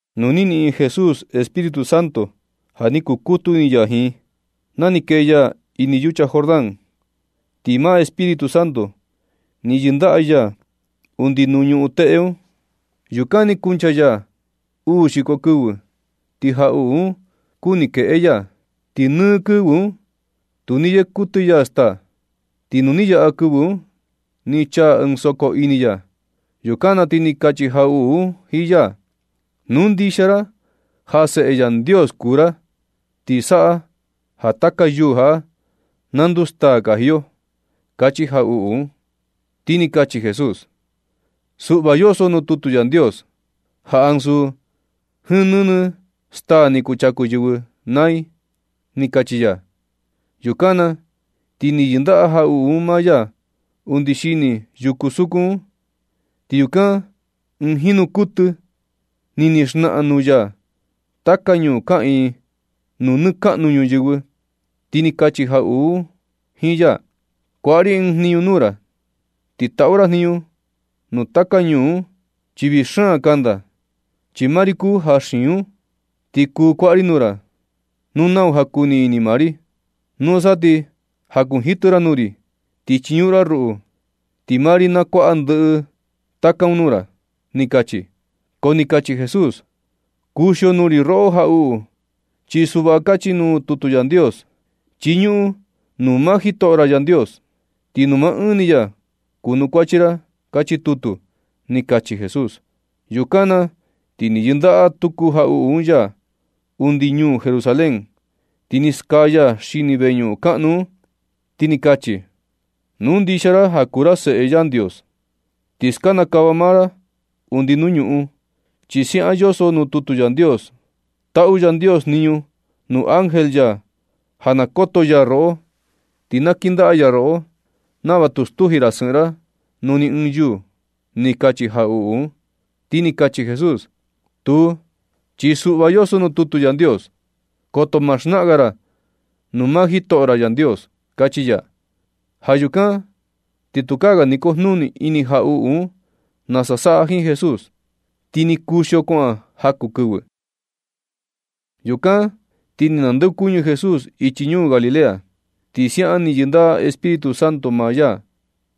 Nu ni niꞌin Jesús Espíritu Santo ja ni kukutu ini ya jiin, na ni kee ya ini yucha Jordán, ti maa Espíritu Santo ni yɨndaꞌa ya undi nuu ñuꞌun teꞌe un. Yukan ni kuncha ya uu xiko kɨvɨ, ti jaꞌuꞌu un kuni keꞌe ya. Ti nɨ kɨvɨ un, tu ni yee kuɨtɨ ya staa. Ti nu ni yaꞌa kɨvɨ un, ti ni chaa soko ini ya. Yukan na ti ni kachi jaꞌuꞌu un jiin ya: ―Nu ndixia ra ja Seꞌe Yandios kuu ra, ti saꞌa ja taka yuu jaꞌa na nduu staa kaji yo ―kachi jaꞌuꞌu un. Ti ni kachi Jesús: ―Suꞌva yoso nuu tutu Yandios ja ansu jiin nɨnɨ staa kuchaku yɨvɨ naa i ―ni kachi ya. Yukan na ti ni yɨndaꞌa jaꞌuꞌu un maa ya undi xini yuku sukun un. Ti yukan ɨɨn jinu kuɨtɨ ni ni xnaꞌan nuu ya taka ñuu kaꞌiin nuu nɨɨ kaꞌnu ñuyɨvɨ, ti ni kachi jaꞌuꞌu jiin ya: ―Kuaꞌa ri ɨɨn jniñu nuu ra ti taꞌu ra jniñu nu taka ñuu un, chi vii xaan kanda, chi maa ri kuu ja xiin un. Ti kuu kuaꞌa ri nuu ra, nuu nau ja kuu ini maa ri. Nusa ti jakunjitɨ ra nuu ri, ti chiñuꞌun ra ruꞌu, ti maa ri na kuaꞌa ndɨꞌɨ taka un nuu ra ―ni kachi. Ko ni kachi Jesús: ―Kuxio nuu ri roꞌo jaꞌuꞌu, chi suꞌva kachi nuu tutu Yandios: “Chiñuꞌun nuu maa Jitoꞌo ra Yandios, ti nuu maa ɨɨn ni ya kunukuachi ra”, kachi tutu ―ni kachi Jesús. Yukan na ti ni yɨndaꞌa tuku jaꞌuꞌu un ya undi ñuu Jerusalén, ti ni skaa ya xini veñuꞌun kaꞌnu un, ti ni kachi: ―Nu ndixia ra ja kuu ra Seꞌe Yandios, ti skanakava maa ra undi nuu ñuꞌun, chi siaꞌan yoso nuu tutu Yandios: Taꞌu Yandios jniñu nuu ángel ya ja na koto ya roꞌo. Ti na kindaꞌa ya roꞌo nava tu stuji ra sɨꞌɨn ra nuu ni ɨɨn yuu ―ni kachi jaꞌuꞌu un. Ti ni kachi Jesús: ―Tuu, chi suꞌva yoso nuu tutu Yandios: “Koto ma xnaꞌan ga ra nuu maa jitoꞌo ra Yandios” ―kachi ya. Ja yukan ti tukaa ga ni kojnuni ini jaꞌuꞌu un nasa saꞌa jiin Jesús, ti ni kuxio kuaꞌan jaku kɨvɨ. Yukan ti ni nandeokuñɨ Jesús ichi ñuu Galilea, chi siaꞌan ni yɨndaꞌa Espíritu Santo maa ya.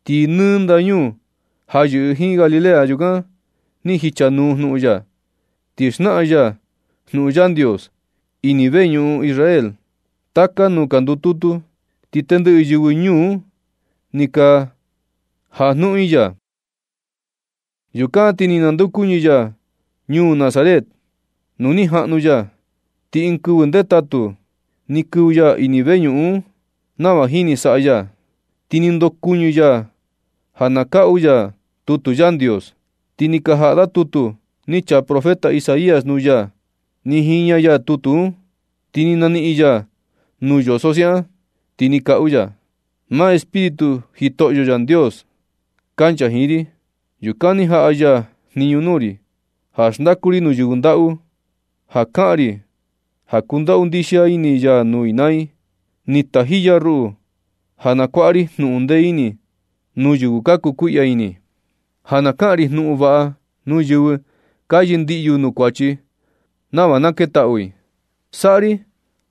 Ti nɨ ndañuu ja yɨꞌɨ jiin Galilea, yukan ni jichanuu jnuꞌun ya. Ti xnaꞌan ya jnuꞌun Yandios ini veñuꞌun Israel taka nuu ka ndututu, ti tendɨꞌɨ yɨvɨ nuu un ni ka jajnuꞌun i ya. Yukan ti ni nandeokuñɨ ya ñuu Nazaret nuu ni jaꞌnu ya. Ti ɨɨn kɨvɨ ndetatu ni kɨvɨ ya ini veñuꞌun un nava jini saꞌa ya. Ti ni ndokuɨñɨ ya ja na kaꞌu ya tutu Yandios. Ti ni ka jaꞌa da tutu ni chaa profeta Isaías nuu ya. Ni jiña ya tutu un, ti ni naniꞌin ya nuu yoso siaꞌan, ti ni kaꞌu ya: Maa Espíritu Jitoꞌyo Yandios kancha jiin ri. Yukan ni jaꞌa ya jniñu nuu ri ja xndaku ri nuu yɨvɨ ndaꞌu, ja kaꞌan ri ja kundaꞌu ndixia ini ya nuu i naa i. Ni taji ya ruꞌu ja na kuaꞌa ri jnuꞌun ndee ini nuu yɨvɨ ka kukuiꞌya ini, ja na kaꞌan ri ɨɨn jnuꞌun vaꞌa nuu yɨvɨ ka yɨndiꞌyu nuu kuachi, nava na ketaꞌu i. Saꞌa ri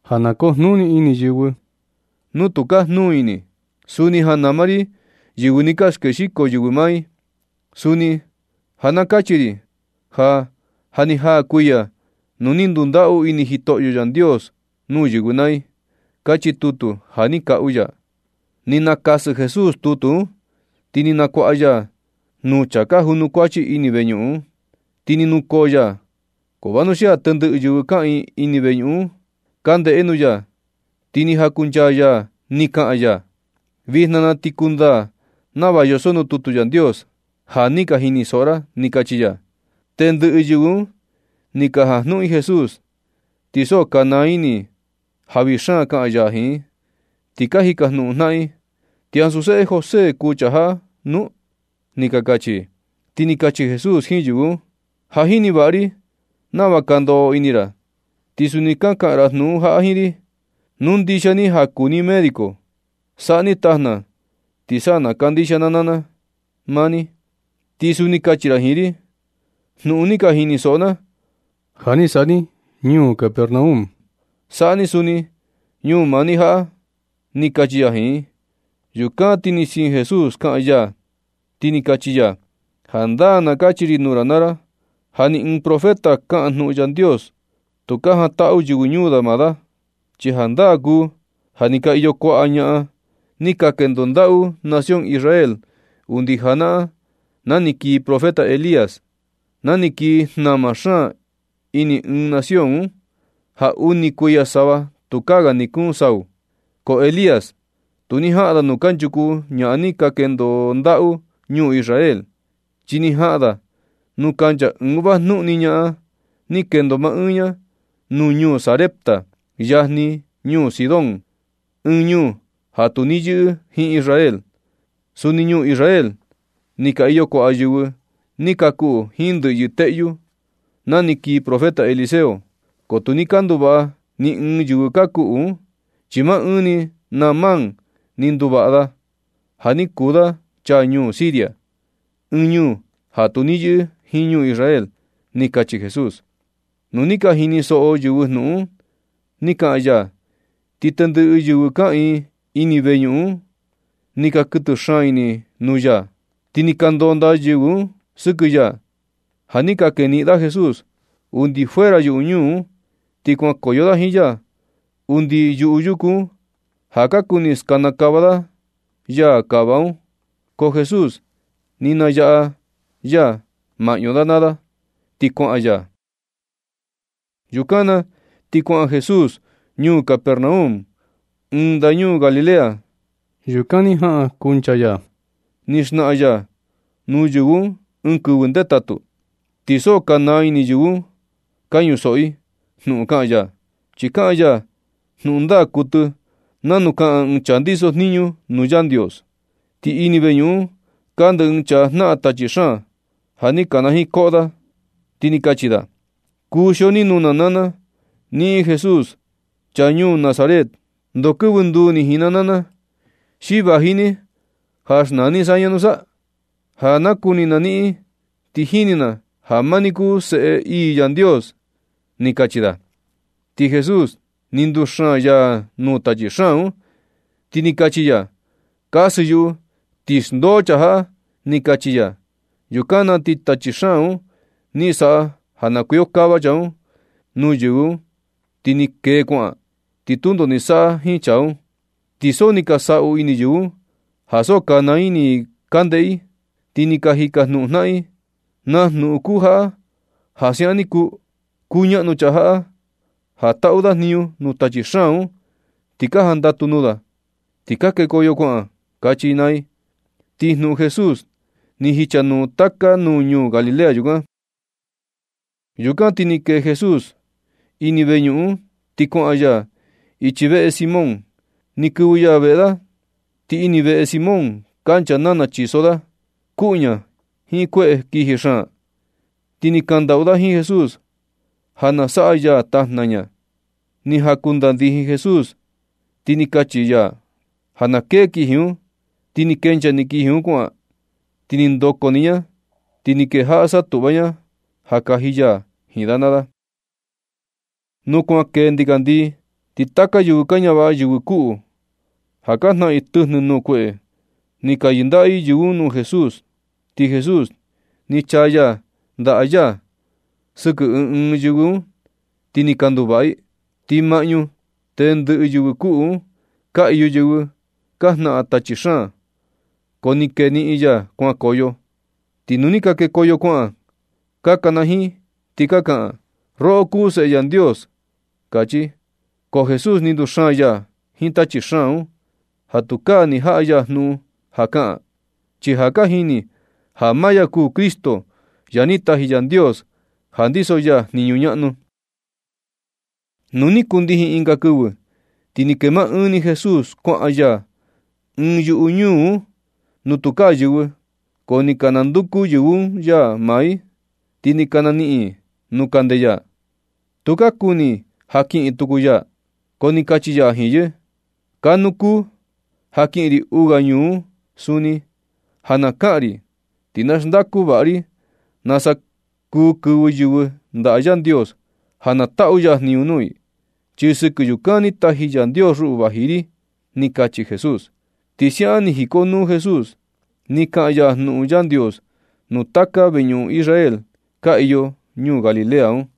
ja na kujnuni ini yɨvɨ tu ka jnuu ini. Suni ja na nama ri yɨvɨ ni ka skexiko yɨvɨ maa i. Ti suni ja na kachi ri ja, ja ni jaa kuiya nu ni ndundaꞌu ini Jitoꞌyo Yandios nuu yɨvɨ naa i. Kachi tutu ja ni kaꞌu ya. Ni nakasɨ Jesús tutu un, ti ni nakuaꞌa ya nuu chaa junukuachi ini veñuꞌun un, ti ni nukoo ya. Ko vanuxia tendɨꞌɨ yɨvɨ kaꞌiin ini veñuꞌun un ka ndeꞌe nuu ya, ti ni jakunchaa ya ni kaꞌan ya: ―Vijna na ti ni kundaa nava yoso nuu tutu Yandios ja ni ka jinisoꞌo ra ―ni kachi ya. Tendɨꞌɨ yɨvɨ un ni ka jajnuꞌun i Jesús, ti so ka naa ini i ja vii xaan kaꞌan ya jiin i, ti ka jikajnuꞌun jnaꞌan i: ―¿Ti ansu seꞌe José kuu chaa jaꞌa nu? ―ni ka kachi i. Ti ni kachi Jesús jiin yɨvɨ un: ―Ja jini vaꞌa ri nava ka ndoꞌo ini ra, ti suni ka kaꞌan ra jnuꞌun jaꞌa jiin ri: “Nu ndixia ni ja kuu ni médico, saꞌa ni tajna ti sa na kandixia na naa na maa ni.” Ti suni kachi ra jiin ri: “Jnuꞌun ni ka jinisoꞌo na, ja ni saꞌa ni ñuu Capernaum, saꞌa ni suni ñuu maa ni jaꞌa” ―ni kachi ya jiin i. Yukan na ti ni siin Jesús kaꞌan ya, ti ni kachi ya: ―Jandaa na kachi ri nuu ra naa ra ja ni ɨɨn profeta kaꞌan jnuꞌun Yandios, tu ka jantaꞌu yɨvɨ ñuu da maa da. Chi jandaa kuu ja ni ka iyo kuaꞌa ñaꞌan ni ka kendo ndaꞌu nación Israel undi janaꞌan na ni kii profeta Elías, na ni kii jnama xaan ini nɨɨ nación un, ja uni kuiya sava tukaa ga ni kuun sau. Ko Elías tu ni jaꞌan da nuu kanchuku ñaꞌan ni ka kendo ndaꞌu ñuu Israel, chi ni jaꞌan da nuu kancha ɨɨn vajnuꞌun ni ñaꞌan ni kendo maa ɨɨn ñaa nuu ñuu Sarepta, yajni ñuu Sidón, ɨɨn ñuu ja tu ni yɨꞌɨ jiin Israel. Suni ñuu Israel ni ka iyo kuaꞌa yɨvɨ ni ka kuꞌu jiin ndɨꞌyɨ teꞌyu na ni kii profeta Eliseo, ko tu ni ka nduvaꞌa ni ɨɨn yɨvɨ ka kuꞌu un, chi maa ɨɨn ni Naamán ni nduvaꞌa, ja ni kuu da chaa ñuu Siria, ɨɨn ñuu ja tu ni yɨꞌɨ jiin ñuu Israel ―ni kachi Jesús. Nu ni ka jinisoꞌo yɨvɨ jnuꞌun ni kaꞌan ya, ti tendɨꞌɨ yɨvɨ kaꞌiin ini veñuꞌun un, ni ka kɨtɨ xaan ini nuu ya. Ti ni ka ndonda yɨvɨ un sɨkɨ ya ja ni ka keniꞌin da Jesús undi fuera yuꞌu ñuu un. Ti kuankoyo da jiin ya undi yuꞌu yuku un ja ka kuni skanakava da yaa kava un. Ko Jesús ni nayaꞌa ya maꞌñu da naa da, ti kuaꞌan ya. Yukan na ti kuaꞌan Jesús ñuu Capernaum, ɨɨn ndañuu Galilea. Yukan ni jaꞌa kunchaa ya ni xnaꞌan ya nuu yɨvɨ un ɨɨn kɨvɨ ndetatu. Ti so ka naa ini yɨvɨ un ka ñusoꞌo i jnuꞌun kaꞌan ya, chi kaꞌan ya jnuꞌun ndaa kuɨtɨ nanu kaꞌan ɨɨn chaa ndiso jniñu nuu Yandios. Ti ini veñuꞌun un kande ɨɨn chaa jnaꞌan tachi xaan, ja ni kanajiin koꞌo, ti ni kachi da: ―Kuxio ni nuu na naa na, niꞌin Jesús, chaa ñuu Nazaret. ¿Ndoo kɨvɨ nduu ni jiin na, xi vaji ni ja xnaa ni saña nu? Ja nakuni na niꞌin, ti jini na ja maa ni kuu seꞌe ii Yandios ―ni kachi da. Ti Jesús ni nduxaan ya nuu tachi xaan un, ti ni kachi ya: ―Kasɨ yuꞌu ti xndoo chaa jaꞌa ―ni kachi ya. Yukan na ti tachi xaan un ni saꞌa ja na kuikokava chaa un nuu yɨvɨ un, ti ni kee kuaꞌan. Ti tundo ni saꞌa jiin chaa un. Ti so ni ka saꞌu ini yɨvɨ un ja so ka naa ini i ka ndeꞌe i, ti ka jikajnuꞌun jnaꞌan i: ―¿Naa jnuꞌun kuu jaꞌa ja siaꞌan ni kuu? Kuñaꞌnu chaa jaꞌa ja taꞌu da jniñu nuu tachi xaan un, ti ka jandatu nuu da, ti ka kekoyo kuaꞌan ―kachi i naa i. Ti jnuꞌun Jesús ni jichanuu taka nuu ñuu Galilea yukan. Yukan na ti ni kee Jesús ini veñuꞌun un ti kuaꞌan ya ichi veꞌe Simón. Ni kɨvɨ ya veꞌe da. Ti ini veꞌe Simón kancha nana chiso da kuꞌu ña jiin kueꞌe kiji xaan. Ti ni kakandaꞌu da jiin Jesús ja na saꞌa ya tajna ña. Ni jankudandijin Jesús, ti ni kachi ya ja na kee kiji un, ti ni kenchaa ni kiji un kuaꞌan. Ti ni ndoko ni ña, ti ni kejaꞌa satuꞌva ña ja ni yaji ya jiin da naa da. Nu kuan kee ndikandii, ti taka yɨvɨ ka ñavaꞌa yɨvɨ kuꞌu, ja ka jnaꞌan i tɨjnɨ nuu kueꞌe, ni ka yɨndaꞌa i yɨvɨ un nuu Jesús, ti Jesús ni chaa ya ndaꞌa ya sɨkɨ ɨɨn ɨɨn yɨvɨ un, ti ni ka nduvaꞌa i. Ti maꞌñu tendɨꞌɨ yɨvɨ kuꞌu un, ka iyo yɨvɨ ka jnaꞌan tachi xaan, ko ni keniꞌin ya kuankoyo. Ti nu ni ka kekoyo kuaꞌan, ka kanajiin ti ka kaꞌan: ―Roꞌo kuu Seꞌe Yandios ―kachi. Ko Jesús ni nduxaan ya jiin tachi xaan un ja tukaa ni jaꞌa ya jnuꞌun ja kaꞌan, chi ja ka jini ja maa ya kuu Cristo, ja ni taji Yandios ja ndiso ya jniñu ñaꞌnu. Nu ni kundijin ɨnga kɨvɨ, ti ni kee maa ɨɨn ni Jesús kuaꞌan ya ɨɨn yuꞌu ñuu un nu tukaa yɨvɨ. Ko ni ka nanduku yɨvɨ un ya naa i, ti ni ka naniꞌin i nuu kande ya. Tu ka kuni i ja kiꞌin tukuu ya, ko ni kachi ya jiin yɨ: ―Kanuu kuu ja kiꞌin ri uu ga ñuu un suni, ja na kaꞌan ri ti na xndaku vaꞌa ri nasa kuu kɨvɨ yɨvɨ ndaꞌa Yandios ja na taꞌu ya jniñu nuu i, chi sɨkɨ yukan ni taji Yandios ruꞌu vaji ri ―ni kachi Jesús. Ti siaꞌan ni jikonuu Jesús ni kaꞌan ya jnuꞌun Yandios nuu taka veñuꞌun Israel ka iyo ñuu Galilea un.